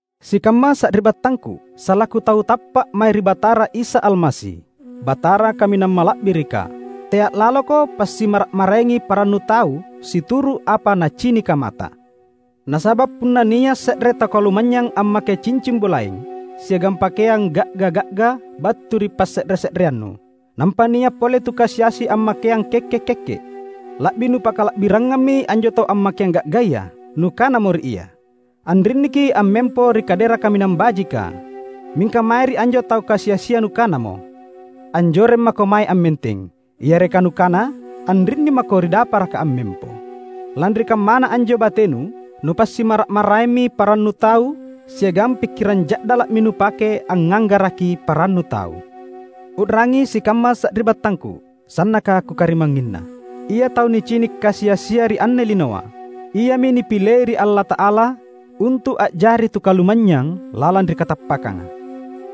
Sikamma sari’battangku! Salaku tau tappa’ mae ri Batara Isa Almasi, Batara Kaminang Mala’birika, tea’ laloko passimmara’-maraengi parannu tau situru’ apa nacinika mata. Nasaba’ punna nia’ se’re tau kalumanynyang ammake cincing bulaeng siagang pakeang ga’ga-ga’ga battu ri passe’re-se’reannu, nampa nia’ pole tu kasi-asi ammakeang kekke’-kekke’, la’bi nupakala’birangammi anjo tau ammakeang ga’gaya. Nukanamo ri ia, "Anrinniki’ ammempo ri kadera kaminang bajika." Mingka mae ri anjo tu kasi-asia nukanamo, "Anjoreng mako mae ammenteng," yareka nukana, "Anrinni mako ri daparaka ammempo." Lanri kammana anjo batenu, nupassimmara’-maraemmi parannu tau siagang pikkirang ja’dala’mi nupake angnganggaraki parannu tau. U’rangi sikamma sari’battangku, sannaka kukarimangnginna! Ia tau nicini’ kasi-asia ri anne linoa, iami nipilei ri Allata’ala untu’ a’jari tu kalumanynyang lalang ri katappakkanga.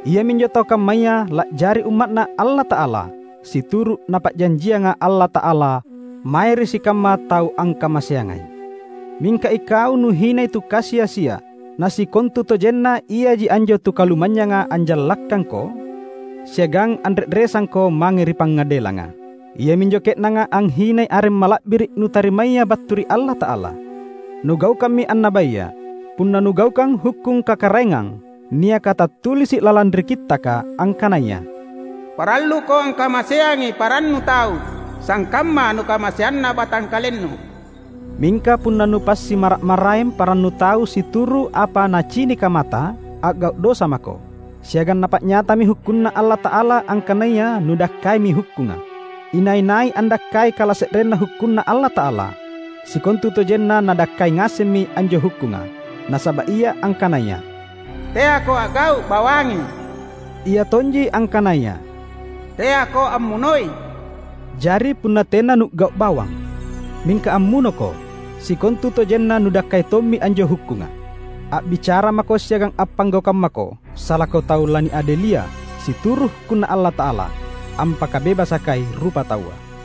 Iaminjo tau kammaya la’jari Umma’Na Allata’ala situru’ Napa’janjianga Allata’ala mae ri sikamma tau angkamaseangai. Mingka ikau nuhinai tu kasi-asia; na sikontutojenna iaji anjo tu kalumanynyanga anjallakkangko siagang anre’resangko mange ri pangadelanga! Iaminjo ke’nanga anghinai areng mala’biri’ nutarimaya battu ri Allata’ala! Nugaukammi annabaya, punna nugaukang hukkung Kakaraengang niaka tattulisi’ lalang ri Kittaka angkanaya, "Paralluko angkamaseangi parannu tau, sangkamma nukamaseanna batangkalennu." Mingka punna nupassimmara’-maraeng parannu tau situru’ apa nacinika mata, a’gau’ dosa mako, siagang napa’nyatami hukkunNa Allata’ala angkanaya nudakkaimi hukkunga. Inai-nai andakkai kalase’renna hukkunNa Allata’ala, sikontutojenna nadakkai ngasemmi anjo hukkunga. Nasaba’ Ia angkanaya, "Teako a’gau’ bawangi," Ia tonji angkanaya, "Teako ammunoi." Jari punna tena nu’gau’ bawang, mingka ammunoko, sikontutojenna nudakkai tommi anjo hukkunga. A’bicara mako siagang appanggaukang mako salaku tau laniadelia situru’ hukkunNa Allata’ala ampakabebasakai rupataua.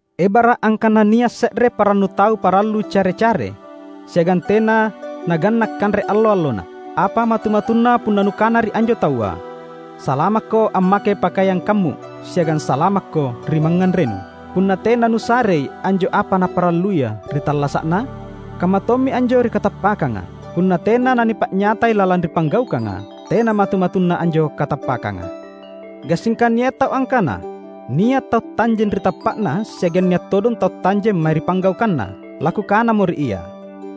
Ebara’ angkana nia’ se’re parannu tau parallu care-care siagang tena nangganna’ kanre allo-allona. Apa matu-matunna punna nukana ri anjo taua, "Salamakko ammake pakeang kammu’ siagang salamakko ri mangnganrenu!" — punna tena nusarei anjo apa naparalluia ri tallasa’na? Kammatommi anjo ri katappakkanga; punna tena nanipa’nyatai lalang ri panggaukanga, tena matu-matunna anjo katappakkanga. Gassingka nia’ tau angkana, "Nia’ tau tanjeng ri tappa’na siagang nia’ todong tau tanjeng mae ri panggaukanna." Lakukanamo ri ia,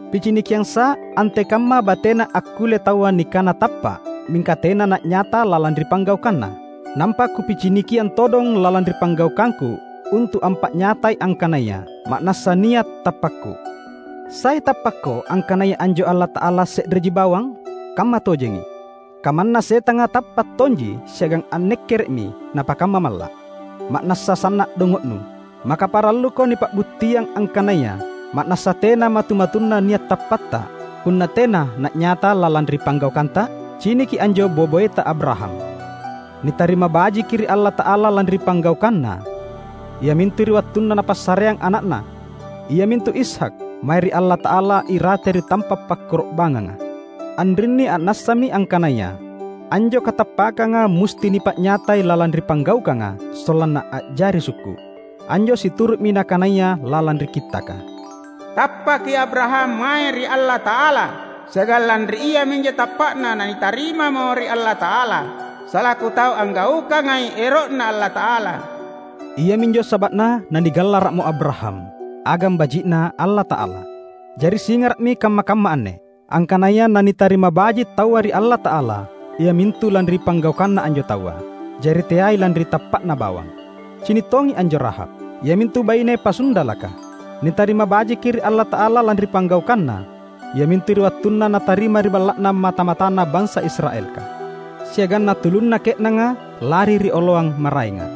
"Picinikiangsa’ antekamma batena akkulle taua nikana tappa’ mingka tena na’nyata lalang ri panggaukanna, nampa kupicinikiang todong lalang ri panggaukangku untu’ ampa’nyatai angkanaya ma’nassa nia’ tappakku." Sai tappakko angkanaya anjo Allata’ala se’reji bawang? Kammatojengi! Kamanna setanga tappa’ tonji siagang annekkere’mi napakamma malla’! Ma’nassa sanna’ dongo’nu! Maka paralluko nipa’buttiang angkanaya ma’nassa tena matu-matunna nia’ tappatta punna tena na’nyata lalang ri panggaukanta? Ciniki anjo boe-boeta Abraham. Nitarima bajiki ri Allata’ala lanri panggaukanna, iamintu ri wattunna napassareang ana’na, iamintu Ishak, mae ri Allata’ala irate ri tampa’ pakkoro’bangnganga. Anrinni a’nassami angkanaya anjo katappakkanga musti nipa’nyatai lalang ri panggaukanga sollanna a’jari sukku’. Anjo situru’mi nakanaya lalang ri Kittaka, "Tappaki Abraham mae ri Allata’ala, siagang lanri iaminjo tappa’na nanitarimamo ri Allata’ala salaku tau anggaukangai ero’Na Allata’ala." Iaminjo saba’na nanigallara’mo Abraham, "Agang baji’Na Allata’ala." Jari singara’mi kamma-kamma anne, angkanaya nanitarima baji’ taua ri Allata’ala iamintu lanri panggaukanna anjo taua; jari teai lanri tappa’na bawang. Cini’ tongi anjo Rahab, iamintu baine pasundalaka. Nitarima bajiki ri Allata’ala lanri panggaukanna, iamintu ri wattunna natarima ri balla’na mata-matana bansa Israelka siagang natulunna ke’nanga lari ri oloang maraenga.